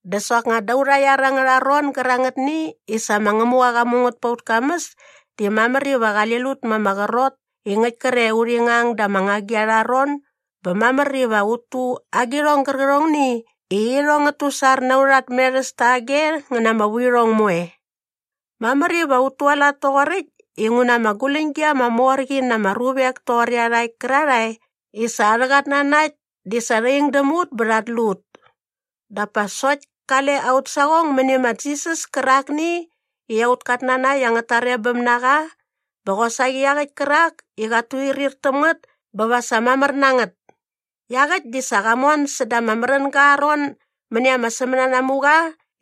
Dä soknga da aurha iar angärha ron gärangätni i sa ma Ngämuqa qa mu ngät pa aut kamäs di mamär iva qali lut ma ama qrot i ngäkt kre i urhi ngang da ama ngagi arha ron bä mamär iva ut tu agirhong gärqärhongni i irhong ngät tusar na aurha tmerhäs tage ngä na ama vuirhong moe. Mamär iva ut tualat toqoräkt inguna ama guläñgi ama mor qi na ama ruvek toqor iarhakt kärarhae i sa arhä qatnanakt di sa rha ing däm ut bä rhat lu ut. Dap pa sokt kale aut saqong mäni ma Jisas kärakni i aut katnanakt angät tarebäm na qa bä qosaqi iaqäkt kärak i qat tuirhir täm ngät bä va sa mamär na ngät. Iaqäkt di sa qa mon säda ama märänga aa ron mäni ama sämänanamuqa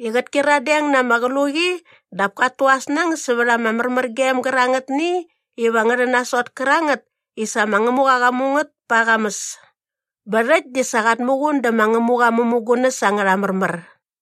i qät kyiradeng na ama qluqi dap kat tu aa snäng sävät ama märmärgem gärangätni iva ngä rhän nasot kärangät i sa ma Ngämuqa qa mu ngät pa aa qamäs. Bä rhäkt di sa qat muqun dä ma Ngämuqa aa mämugunäs angärha märmär.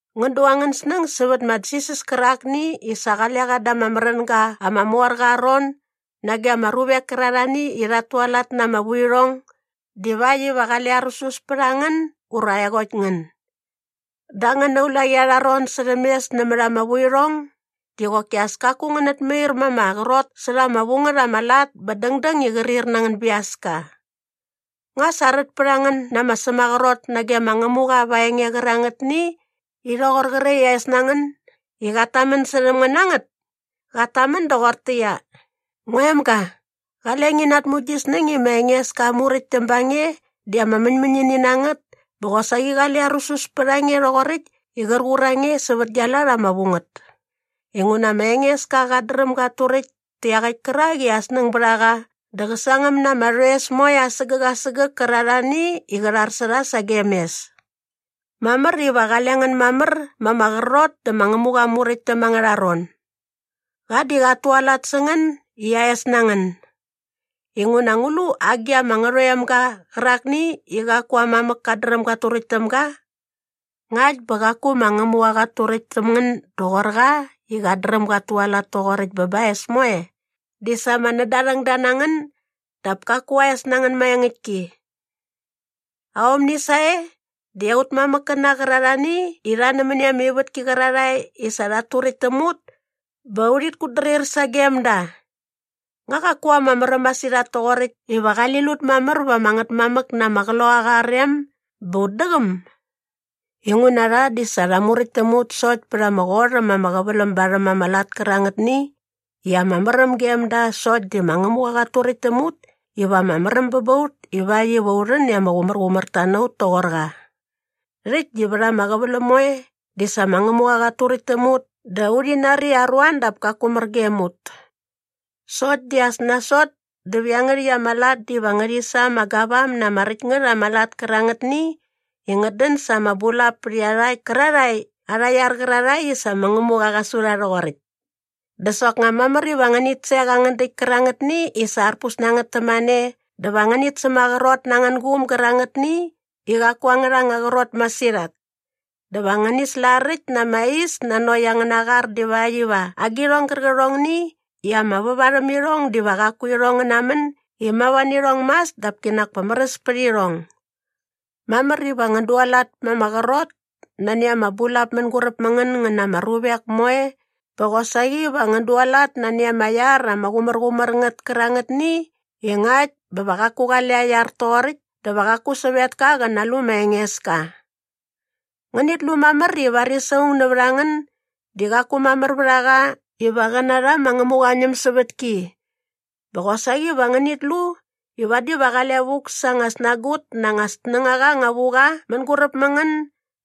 Ngän du angän snäng sävät ma Jisas kärakni i sa qale qa da ama märänga ama mor qa aa ron nage ama ruvek kärarhani i rhat tualat na ama vuirhong divakt iva qale arusus pät a ngän ura aeqokt ngän. Da angäna ulaqi arha ron särhäm mes nämät ama vuirhong di qoki as kaku ngänät mair ma ama qrot särha ama vu ngät ama lat bä dängdäng i qrir na angän biaska. Nga sa rät pät a ngän na ama sämaqrot nage ma Ngämuqa va aa enge qärangätni i rhoqor qre i aa es na ngän i qat tamän särhäm ngän na ngät? Qat tamän doqortäqyia, “Ngua emga, qale ngi natmu gi snäng i ma Engeska aa muräktäm ba nge di ama mäñmäñini na ngät bä qosaqi qale arusus pät a nge rhoqoräkt i qär qur a nge sävät gia lat ama vu ngät. Inguna ma Engeska qat dräm gat turäkt tä iaqäkt kärak i aa snäng bät a qa dä qä sangäm na ama rhoes moe asägäk asägäk kärarhani i qä rhar sä rha sagem mes.” Mamär iva qale ngän mamär ma ama qrot dä ma Ngämuqa aa Muräktäm angärha ron. Qa di qat tualat sä ngän i aa es na ngän. Inguna ngu lu agi ama ngärhoemga qärakni i qaku aa mamäk kat dräm gat turäkt täm ga? Ngakt bä qaku ma Ngämuqa qat turäkt täm ngän doqor qa i qat dräm gat tualat toqoräkt bä ba aa es moe di sa ama nädarhängda na ngän dap kaku aa es na ngän maengäktki. Aomni sae di aut mamäkkäna qärarhani i rha nämäni ama ivätki qärarhae i sa rhat turäkt täm ut bä urhit kutdrir sagem da. Nga qaku ama märäm masirhat toqoräkt iva qali lut mamär vä ama Ngätmamäk na ama qloqaqa aa rem bä ut däqäm? Inguna rha di sa rha muräkt täm ut sokt pät ama qot äm ama qäväläm barhäm ama lat kärangätni i ama märäm gem da sokt di ma Ngämuqa qat turäkt täm ut iva ama märäm bä ba ut ivakt iva u rhän i ama qumärqumärta na ut toqor qa. Rhäkt di vät ama qäväläm moe di sa ma Ngämuqa qat turäkt täm ut dä urhi nari i aruan dap kaku mär gem ut. Sokt di as nasot dä va iangärhäkt ama lat diva ngärhi sa ama gavam na ama räkt ngät ama lat kärangätni i ngät dän sa ama bulap pät iarhakt kärarhae arha iar qärarhae i sa ma Ngämuqa qa su rha rhoqoräkt. Dä soknga mamär iva ngänit sek angän däkt kärangätni i sa arpus na ngät tämane dä va ngänit sämaqrot na angän guum gärangätni i qaku angärha anga qrot masirhat. Dä va ngäni slaräkt na ama is nanokt angäna qar divakt iva agirhong gärqärhongni i ama väva rhäm irhong diva qaku irhong ngä namän i mava nä irhong mas dap kinak pa märäs pät irhong. Mamär iva ngän dualat ma ama qrot nani ama bulap mänguräp mä ngän ngän na ama ruvek moe bä qosaqi va ngän dualat nani ama iar ama qumärqumär ngät kärangätni i ngakt bä va qaku qale aa iar toqoräkt dä va qaku sävetka qä nalu ma Engeska. Ngänit lu mamär i varis aung nävät a ngän di qaku mamär vät a qa iva qä narha ma Ngämuqa aa ñämsävätki. Bä qosaqi va ngänit lu i vadi va qale vuk sa “anga snagut na anga snängaqa anga vu qa” mänguräp mä ngän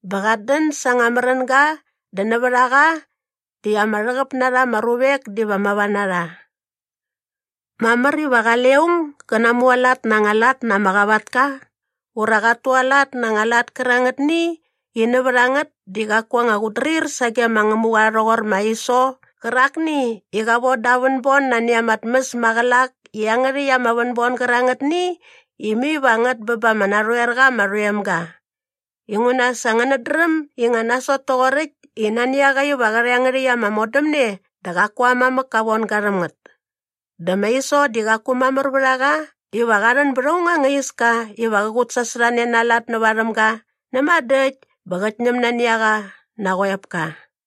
bä qat dän sa anga märänga dä nävät a qa di ama rhäqäp na rha ama ruvek diva mava na rha. Mamär iva qale aung gä namualat na anga lat na ama qavatka ura qat tualat na anga lat kärangätni i nävät a ngät di qaku anga qutdrir sage ma Ngämuqa rhoqor ma Iso qärakni i qa voda aa vänbon nani ama tmäs maqälak i iangärhäkt ama vänbon gärangätni i mai va ngät bä ba ama narhoer qa ama rhoemga. Inguna sa ngänät dräm i nga nasot toqoräkt i nani a qa iva qä rha iangärhäkt ama modämne dä qaku aa mamäk ka von ga rhäm ngät. Dä ma Iso di qaku mamär vät a qa iva qa rhän bät aung anga iska iva qä qutsasorhane na aa lat näväm ga näma dä äkt bä qät ñäm nani a qa na aa qoepka.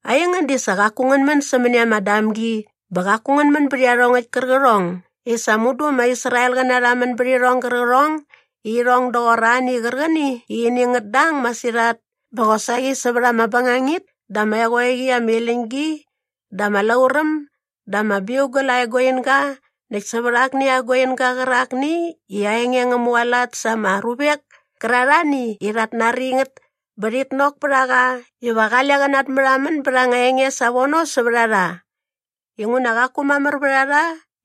Aingän di sa qaku ngän män sämäni ama damgi bä qaku ngän män bät iarhongäkt kärqärhong i sa mudu ama Israelqäna rha män bät irhong gärqärhong i irhong doqor ani qärqäni i ini ngät dang masirhat bä qosaqi sävät ama bängangit dä ama eqoeqi ama iläñ gi dä ama lauräm dä ama biugal aa eguinga näkt sävät akni aa eguinga qärakni i aa enge ngä mualat sa ama ruvek kärarhani i rhat nari ngät bä rhit nok pät a qa iva qale qä natmärhamän bät anga enge savono sävät a rha. Inguna qaku mamär vät a rha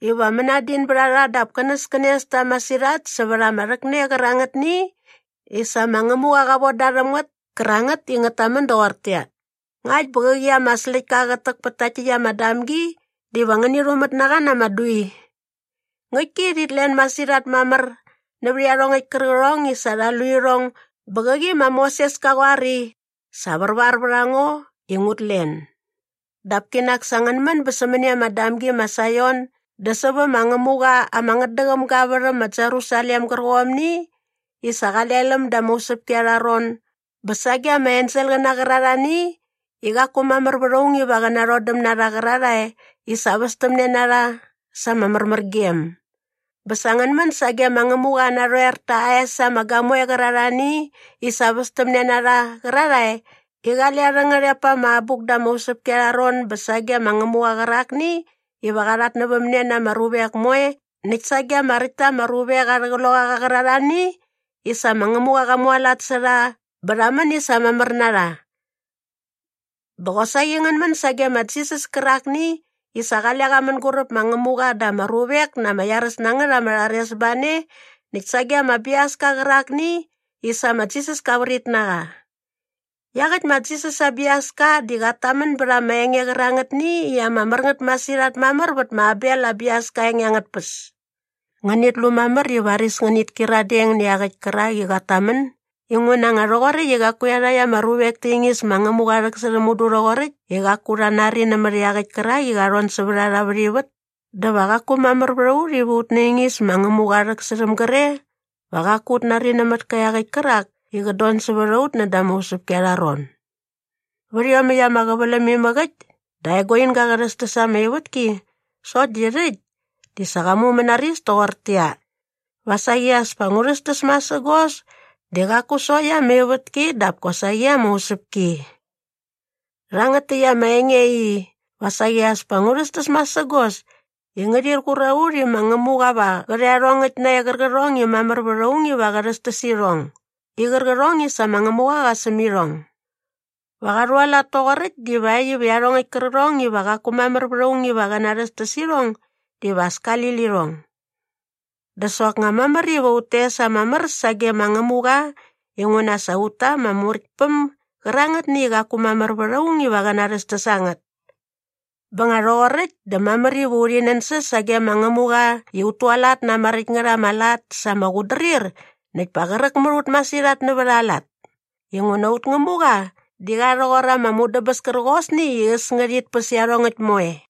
iva mänadin bät a rha dap känäskänes ta masirhat sävät ama rhäkne qärangätni i sa ma Ngämuqa qa von da rhäm ngät kärangät i ngät tamän doqortäqyia, “Ngakt bä qäqi ama släktka qät täk pät takt täkt ama damgi diva ngäni rhumät na qa na ama dui.” Ngäktki i rhit len masirhat mamär nävät iarhongäkt kärqärhong i sa rha lu irhong bä qäqi ma Moses ka qoar i, “Sa värvar vät a ngo i ngut len.” Dap kinak sa ngän män bä sämäni ama damgi ma Saion dä sävä ma Ngämuqa ama ngätdäqäm ga aa värhäm ma Jerusalem gärqomni i sa qale läm da ama usäpki arha ron bä sage ama enselqäna qärarhani i qaku mamär vät aung iva qä narhodäm na rha qärarhae i sa västämne na rha sa ama märmärgem. Bä sa ngän män sage ma Ngämuqa aa narhoer ta aa es ama gamoe qärarhani i sa västämne na rha qärarhae i qale arhä ngärhep pa ama abuk da ama usäpki arha ron bä sage ma Ngämuqa qärakni iva qa rhatnävämne na ama ruvek moe näkt sage ama räkt ta ama ruvek arhä qloqaqa qärarhani i sa ma Ngämuqa qa mualat sä rha bä rha män i sa mamär na rha. Bä qosaqi ngän män sage ma Jisas kärakni i sa qale qa mänguräp ma Ngämuqa dä ama ruvek na ama iaräs na ngät ama rharesbane näkt sage ama biaska qärakni i sa ma Jisas ka vrit na qa. Iaqäkt ma Jisas aa biaska di qat tamän bät ama enge qärangätni i ama mär ngät masirhat mamär vät ma Abel aa biaska aa enge angät tpäs. Ngänit lu mamär i varis ngänit kyiradeng nä iaqäkt kärak i qat tamän inguna nga rhoqoräkt i qaku iarhakt ama ruvek ta ingis ma Ngämuqa aa rhäksärhäm mudu rhoqoräkt i qaku rha nari nämät iaqäkt kärak i qa rhon sävät a rha vät ivät dä va qaku mamär vät a ut iva ut naingis ma Ngämuqa aa rhäksärhäm gre va qaku ut nari nämät iaqäkt kärak i qät don sävät a ut näda ama usäpki arha ron. Vät iomäkt ama qäväläm imäk äkt dä aa eguinga qa rhästäs ama ivätki sokt di rhäkt di sa qa mumänaris toqortäqyia, “Va saqi as pa ngu rhästäs masägos di qaku sokt ama ivätki dap kosaqi ama usäpki.” Rhangät täkt ama enge i, “Va saqi as pa ngu rhästäs masägos” di ngärhir qur a ut i ma Ngämuqa va qä rha iarhongäkt nae qärqärhong i mamär vät aung iva qä rhästäs irhong i qärqärhong i sa ma Ngämuqa qa säm irhong. Va qa rhualat toqoräkt divakt iva iarhongäkt kärqärhong iva qaku mamär vät aung iva qä rhästäs irhong diva as kali lirhong. Dä soknga mamär iva ut tes ama mär sage ma Ngämuqa inguna sa ut ta ama Muräktpäm gärangätni i qaku mamär vät aung iva qä narhästäs a ngät. Bä nga rhoqoräkt dä mamär iva urhi nänsäs sage ma Ngämuqa i ut tualat na ama räkt ngät ama lat sa ama qutdrir näkt pa qräk mät ut masirhat nävät aa lat inguna aut Ngämuqa di qa rhoqor ama mudäbäs kärqosni i äs ngärhit päs iarhongäkt moe.